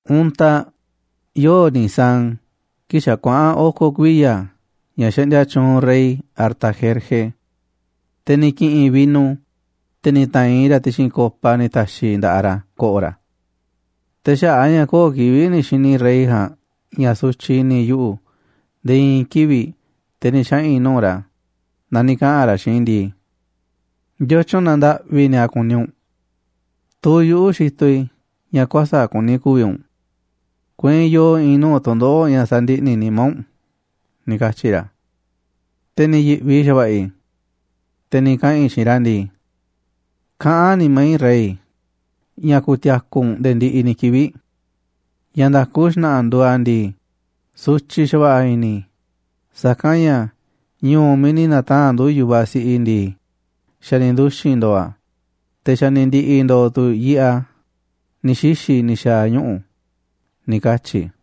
Untaꞌ, yoo̱ꞌ Nisán kii̱ꞌ xa̱ kuaꞌa̱n oko̱ kuiya̱ ña̱ xaꞌndia tyuunꞌ rey Artajerje, te̱ ni̱ ki̱ꞌi̱n i̱ vino, te̱ ni̱ ta̱a̱nꞌ i̱ raꞌ ti̱xi̱n copa ni̱ ta̱xi̱ i̱ nda̱ꞌaꞌ ra̱ ko̱ꞌo̱ ra̱. Te̱ xaꞌa̱ꞌ a̱ ña̱ köo̱ꞌ kivi̱ꞌ ni̱ xi̱ni̱ rey ja̱a̱nꞌ ña̱ sutyiꞌ i̱ni̱ yuꞌu̱ nde̱e̱ i̱i̱n kivi̱ꞌ te̱ ni̱ xaꞌa̱n i̱ nuu̱ꞌ ra̱, na ni̱ kaꞌa̱n ra̱ xiinꞌ i̱ ndii: ―¿Ndiotyun na ndaꞌvi nia kuni u̱nꞌ? Tuu yuꞌu̱ xitoꞌ i̱ ña̱ kuäsa̱ꞌ kuni ku̱vi̱ u̱nꞌ. Kueinꞌ yoo i̱i̱n nuu̱ꞌ tu̱ndoꞌo̱ꞌ ña̱ sa̱ndiꞌni̱ nimá u̱nꞌ ―ni̱ katyi̱ ra̱. Te̱ ni̱ yi̱ꞌvi xa̱va̱ꞌa̱ i̱. Te̱ ni̱ kaꞌa̱n i̱ xiinꞌ ra̱ ndii: ―Kaꞌán nimá i̱, rey, ña̱ ku̱ti̱a̱ku̱ u̱nꞌ nde̱e̱ ndiꞌiꞌ ni̱ kivi̱ꞌ. Ña̱ nda̱ku xna̱ꞌa̱ nduuꞌ a̱ ndii, sutyiꞌ xa̱va̱ꞌa̱ i̱ni̱ i̱ sa̱kanꞌ ña̱ ñu̱u̱ miiꞌ ni̱ na̱taa̱nꞌ ndu̱ yu̱vaꞌ si̱ꞌiꞌ i̱ ndii, xa̱ ni̱ nduxi̱n ndo̱o̱ a̱, te̱ xa̱ ni̱ ndi̱ꞌi̱ ndo̱o̱ tu̱ yiꞌeꞌ a̱ ni̱ xixi̱ ni̱ xa̱a̱ ñuꞌu̱ ―ni̱ katyi̱ i̱.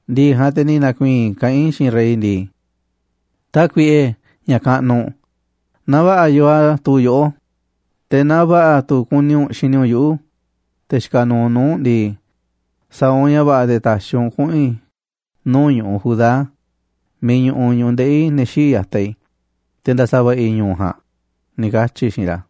ndi̱ꞌi̱ ja̱a̱nꞌ, te̱ ni̱ na̱ku̱i̱i̱n i̱ kaꞌán i̱ xiinꞌ rey ndii: ―Tákuiꞌe, ña̱ kaꞌnuꞌ, naaꞌ va̱ꞌa̱ yoo a̱ tuu yoꞌó, te̱ naaꞌ va̱ꞌa̱ tu̱ kuni u̱nꞌ xini u̱nꞌ yuꞌu̱, te̱ xikaꞌ nuuꞌ nuu̱ꞌ u̱nꞌ ndii, sa̱a̱ u̱nꞌ ña̱ va̱ꞌa̱ te̱ ta̱xi̱ u̱nꞌ kuꞌu̱n i̱ nuu̱ꞌ ñu̱ꞌuꞌ Judá miiꞌ ñuꞌuꞌ ñu̱ꞌuꞌ ndeꞌi̱ ne̱ xíiꞌ ya̱taꞌ i̱, te̱ nda̱sa̱va̱ꞌa̱ i̱ ñu̱u̱ ja̱a̱nꞌ ―ni̱ katyi̱ i̱ xiinꞌ ra̱.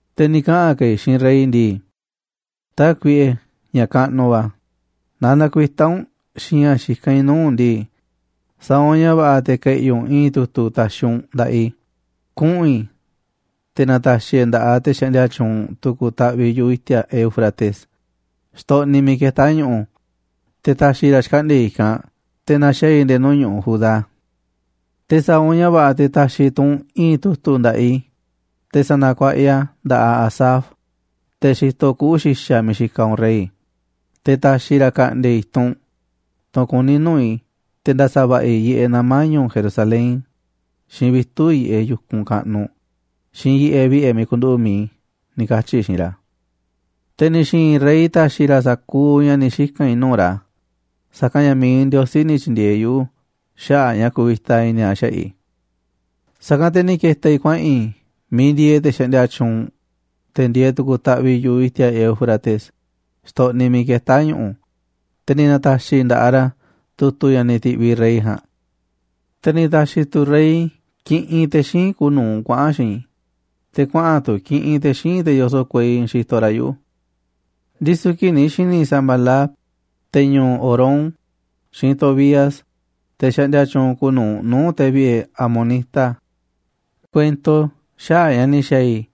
Te̱ ni̱ kaꞌa̱n ka̱ i̱ xiinꞌ rey ndii: ―Tákuiꞌe, ña̱ kaꞌnuꞌ va̱, naaꞌ nakuitá u̱nꞌ xiinꞌ ña̱ xikán i̱ nuu̱ꞌ u̱nꞌ ndii, sa̱a̱ u̱nꞌ ña̱ va̱ꞌa̱ te̱ ke̱ꞌi̱ u̱nꞌ i̱i̱n tu̱tu̱ ta̱xi̱ u̱nꞌ nda̱ꞌaꞌ i̱ kuꞌu̱n i̱ te̱ na̱ta̱xi̱ e̱ꞌ a̱ nda̱ꞌaꞌ te̱ xaꞌndia tyuunꞌ tu̱ku̱ taꞌviꞌ yu̱ꞌuꞌ i̱ti̱a̱ Éufrates, xtoꞌniꞌ miiꞌ ketá ñu̱ꞌu̱, te̱ ta̱xi̱ ra̱ xkaꞌndi̱a̱ i̱ i̱kanꞌ te̱ na̱xaa̱ i̱ nde̱e̱ nuu̱ꞌ ñu̱ꞌuꞌ Judá. Te̱ sa̱a̱ u̱nꞌ ña̱ va̱ꞌa̱ te̱ ta̱xi̱ tu̱ u̱nꞌ i̱i̱n tu̱tu̱ nda̱ꞌaꞌ i̱ te̱ sa̱na̱kuaꞌa i̱ a̱ nda̱ꞌaꞌ Asaf, te̱ xitoꞌ kuꞌu̱ xi̱xa̱ miiꞌ xikaꞌ u̱nꞌ rey, te̱ ta̱xi̱ ra̱ ka̱ꞌndi̱a̱ i̱ i̱tunꞌ, tunꞌ kuní nuu̱ꞌ i̱ te̱ nda̱sa̱va̱ꞌa̱ i̱ yiꞌeꞌ nama̱ ñu̱u̱ Jerusalén, xiinꞌ vitu̱ꞌ yiꞌeꞌ yu̱kunꞌ kaꞌnuꞌ, xiinꞌ yiꞌeꞌ vi̱ꞌe̱ miiꞌ ku̱nduꞌu̱ꞌ mi̱iꞌ i̱ ―ni̱ katyi̱ i̱ xiinꞌ ra̱. Te̱ ni̱ xi̱i̱n rey ta̱xi̱ ra̱ sa̱kuuꞌ ña̱ ni̱ xika̱n i̱ nuu̱ꞌ ra̱, sa̱kanꞌ ña̱ mi̱iꞌ Ndiosí ni̱ tyi̱ndi̱e̱eꞌ yuꞌu̱ xaꞌa̱ꞌ a̱ ña̱ kuvita i̱ni̱ a̱ xaꞌa̱ꞌ i̱. Sa̱kanꞌ te̱ ni̱ ke̱ta̱ i̱ kuaꞌa̱n i̱ miiꞌ ndieeꞌ te̱ xaꞌndia tyuunꞌ, te̱ ndieeꞌ tu̱ku̱ taꞌviꞌ yu̱ꞌuꞌ i̱ti̱a̱ Éufrates, xtoꞌniꞌ miiꞌ ketá ñu̱ꞌu̱, te̱ ni̱ na̱ta̱xi̱ i̱ nda̱ꞌaꞌ ra̱ tu̱tu̱ ña̱ ni̱ ti̱ꞌviꞌ rey ja̱a̱nꞌ. Te̱ ni̱ ta̱xi̱ tu̱ rey kiꞌinꞌ te̱ xíinꞌ kuuꞌ nu̱uꞌ kuaꞌa̱n xiinꞌ i̱, te̱ kuaꞌa̱n tu̱ kiꞌinꞌ te̱ xíinꞌ te̱ yoso̱ꞌ kuei xitoꞌ ra̱ yuꞌu̱. Ndisu̱ kii̱ꞌ ni̱ xi̱ni̱ Sambalat, te̱ ñu̱u̱ Horón, xiinꞌ Tobías, te̱ xaꞌndia tyuunꞌ kuuꞌ nu̱uꞌ nuu̱ꞌ te̱ vi̱ꞌe̱ amonita, kuento xaꞌa̱ꞌ ña̱ ni̱ xa̱a̱ i̱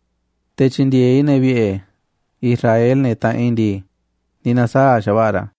te̱ tyi̱ndi̱e̱eꞌ i̱ ne̱ vi̱ꞌe̱ Israel, ne̱ taꞌanꞌ i̱ ndii, ni̱ na̱saa̱ꞌ xa̱va̱ꞌa̱ ra̱.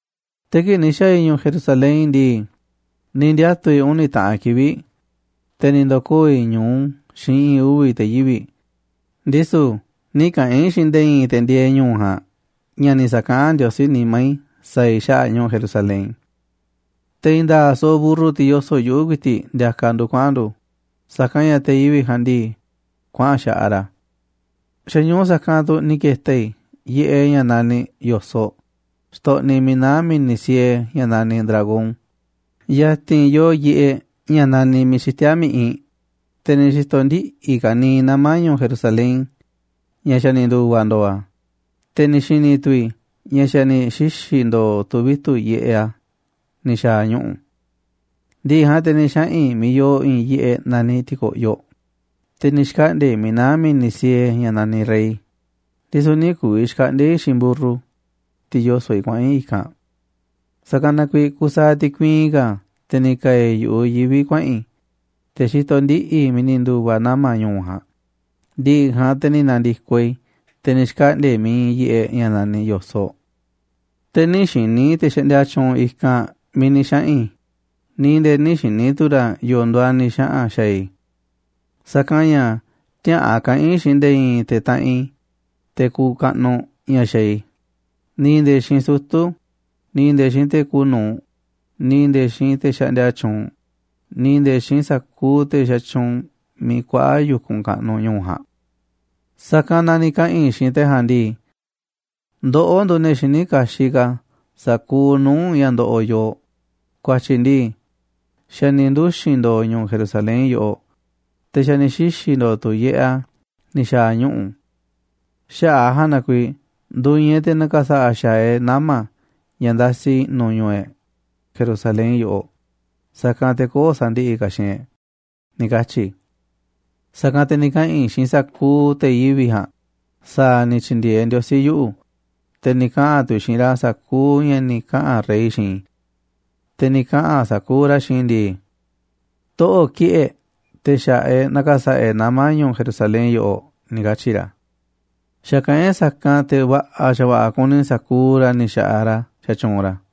Te̱ kii̱ꞌ ni̱ xa̱a̱ i̱ ñu̱u̱ Jerusalén ndii, ni̱ ndiatu̱ i̱ uni̱ taꞌan kivi̱ꞌ, te̱ ni̱ ndo̱koo̱ i̱ ñu̱u xiinꞌ i̱i̱n uvi̱ te̱ yivi̱ꞌ, ndisu̱ nï̱ kaꞌa̱n i̱ xiinꞌ nde̱e̱ i̱i̱n te̱ ndieeꞌ ñu̱u̱ ja̱a̱nꞌ ña̱ ni̱ sa̱kaꞌán Ndiosí nimá i̱ sa̱a̱ i̱ xaꞌa̱ꞌ ñu̱u̱ Jerusalén. Te̱ i̱i̱n nda̱a̱ꞌ soꞌoꞌ mburru, tiꞌ yoso̱ꞌ yuꞌu̱, ku̱i̱ti̱ꞌ ndiakaꞌ ndu̱ kuaꞌa̱n ndu̱, sa̱kanꞌ ña̱ te̱ yivi̱ꞌ ja̱a̱nꞌ ndii, kuaꞌa̱n xaꞌaꞌ ra̱. Xa̱ ñu̱u sa̱kanꞌ tu̱ ni̱ ke̱ta̱ i̱ yiꞌeꞌ ña̱ naniꞌ Yo̱soꞌ, xtoꞌniꞌ miiꞌ naá mi̱ni̱ siee ña̱ naniꞌ Dragón ya̱ti̱n yooꞌ yiꞌeꞌ ña̱ naniꞌ Miiꞌ Xitíá Mi̱ꞌiꞌ, te̱ ni̱ xi̱to̱ ndiꞌi̱ i̱ kaniiꞌ nama̱ ñu̱u̱ Jerusalén ña̱ xa̱ ni̱ ndu̱va̱ ndo̱o̱ a̱, te̱ ni̱ xi̱ni̱ tu̱ i̱ ña̱ xa̱ ni̱ xixi̱ ndo̱o̱ tu̱ vitu̱ꞌ yiꞌeꞌ a̱ ni̱ xa̱a̱ ñuꞌu̱. Ndi̱ꞌi̱ ja̱a̱nꞌ te̱ ni̱ xaꞌa̱n i̱ miiꞌ yooꞌ i̱i̱n yiꞌeꞌ naniꞌ Ti̱ko̱ꞌyoꞌ, te̱ ni̱ xkaꞌndi̱a̱ i̱ miiꞌ naá mi̱ni̱ siee ña̱ naniꞌ Rey, ndisu̱ nï̱ ku̱vi̱ xkaꞌndi̱a̱ i̱ xiinꞌ mburru, tiꞌ yoso̱ꞌ i̱, kuaꞌa̱n i̱ i̱kanꞌ. Sa̱kanꞌ na kuiiꞌ kusaaꞌ ti̱kuiin ka̱ te̱ ni̱ ka̱a̱ i̱ yu̱ꞌuꞌ yivi̱ kuaꞌa̱n i̱, te̱ xitoꞌ ndiꞌi̱ i̱ miiꞌ ni̱ ndu̱va̱ nama̱ ñu̱u̱ ja̱a̱nꞌ, ndi̱ꞌi̱ ja̱a̱nꞌ te̱ ni̱ na̱ndi̱koꞌ i̱, te̱ ni̱ xkaꞌndi̱a̱ i̱ miiꞌ iinꞌ yiꞌeꞌ ña̱ naniꞌ Yo̱soꞌ. Te̱ nï̱ xi̱ni̱ te̱ xaꞌndia tyuunꞌ i̱kanꞌ miiꞌ ni̱ xaꞌa̱n i̱, ni̱ nde̱e̱ nï̱ xi̱ni̱ tu̱ ra̱ yo̱o̱ nduuꞌ a̱ ni̱ xaꞌa̱n xa̱a̱ i̱. Sa̱kanꞌ ña̱ tiäa̱ꞌan kaꞌa̱n i̱ xiinꞌ nde̱e̱ i̱i̱n te̱ taꞌanꞌ i̱, te̱ kuuꞌ kaꞌnuꞌ, ña̱ xaaꞌ i̱, ni̱ nde̱e̱ xiinꞌ sutu̱, ni̱ nde̱e̱ xiinꞌ te̱ kuuꞌ nu̱uꞌ, ni̱ nde̱e̱ xiinꞌ te̱ xaꞌndia tyuunꞌ, ni̱ nde̱e̱ xiinꞌ sa̱kuuꞌ te̱ xatyuunꞌ miiꞌ kuaꞌa yu̱kunꞌ kaꞌnuꞌ ñu̱u̱ ja̱a̱nꞌ. Sa̱kanꞌ na ni̱ kaꞌa̱n i̱ xiinꞌ te̱ ja̱a̱nꞌ ndii: ―Ndoꞌó nduuꞌ ne̱ xiní kaxiꞌ ka̱ sa̱kuuꞌ nuu̱ꞌ ña̱ ndoꞌoꞌ yooꞌ, ku̱a̱tyi̱ ndii xa̱ ni̱ nduxi̱n ndo̱o̱ ñu̱u̱ Jerusalén yoꞌoꞌ, te̱ xa̱ ni̱ xixi̱ ndo̱o̱ tu̱ yiꞌeꞌ a̱ ni̱ xa̱a̱ ñuꞌu̱. Xaꞌa̱ꞌ a̱ ja̱a̱nꞌ na kuiiꞌ ndu̱i̱i̱n e̱ꞌ te̱ na̱ka̱sa̱ꞌa̱ xa̱aꞌ e̱ꞌ nama̱ ña̱ ndasi i̱ꞌnu̱ ñu̱u̱ e̱ꞌ, Jerusalén yoꞌoꞌ, sa̱kanꞌ te̱ köo̱ꞌ sa̱ndi̱ꞌi̱ ka̱ xiinꞌ e̱ꞌ ―ni̱ katyi̱ i̱. Sa̱kanꞌ te̱ ni̱ kaꞌa̱n i̱ xiinꞌ sa̱kuuꞌ te̱ yivi̱ꞌ ja̱a̱nꞌ sa̱a̱ ni̱ tyi̱ndi̱e̱eꞌ Ndiosí yuꞌu̱, te̱ ni̱ kaꞌa̱n tu̱ i̱ xiinꞌ ra̱ sa̱kuuꞌ ña̱ ni̱ kaꞌa̱n rey xiinꞌ i̱. Te̱ ni̱ kaꞌa̱n sa̱kuuꞌ ra̱ xiinꞌ i̱ ndii: ―Toꞌo̱ꞌ kiꞌi̱ꞌ e̱ꞌ te̱ xa̱ꞌaꞌ e̱ꞌ na̱ka̱sa̱ꞌa̱ e̱ꞌ nama̱ ñu̱u̱ Jerusalén yoꞌoꞌ ―ni̱ katyi̱ ra̱. Xa̱kaꞌán e̱ꞌ sa̱kanꞌ te̱ va̱ꞌa̱ xa̱va̱ꞌa̱ kuni sa̱kuuꞌ ra̱ ni̱ xa̱ꞌaꞌ ra̱ xatyuunꞌ ra̱.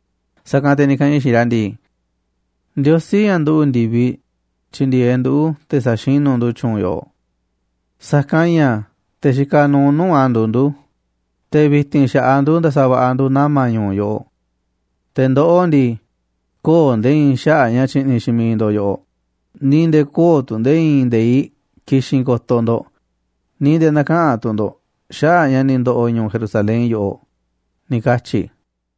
Sa̱kanꞌ te̱ ni̱ kaꞌa̱n i̱ xiinꞌ ra̱ ndii: ―Ndiosí, ña̱ nduꞌu̱ꞌ ndi̱viꞌ, tyi̱ndi̱e̱eꞌ nduꞌu̱ te̱ saxinu̱ ndu̱ tyu̱u̱n yoꞌoꞌ, sa̱kanꞌ ña̱ te̱ xikaꞌ nuuꞌ nuu̱ꞌ a̱ nduuꞌ ndu̱, te̱ vi̱ti̱n xa̱ꞌaꞌ ndu̱ nda̱sa̱va̱ꞌa̱ ndu̱ nama̱ ñu̱u̱ yoꞌoꞌ. Te̱ ndoꞌó ndii, köo̱ꞌ nde̱e̱ i̱i̱n xaꞌa̱ꞌ ña̱ tyi̱ꞌni̱ xiinꞌ miiꞌ ndo̱ꞌ yoꞌoꞌ, ni̱ nde̱e̱ köo̱ꞌ tu̱ nde̱e̱ i̱i̱n nde̱iꞌ ki̱xi̱n ko̱to̱ ndo̱ꞌ, ni̱ nde̱e̱ näkaꞌanꞌ tu̱ ndo̱ꞌ xaꞌa̱ꞌ ña̱ ni̱ ndo̱ꞌo̱ ñu̱u̱ Jerusalén yoꞌoꞌ ―ni̱ katyi̱ i̱.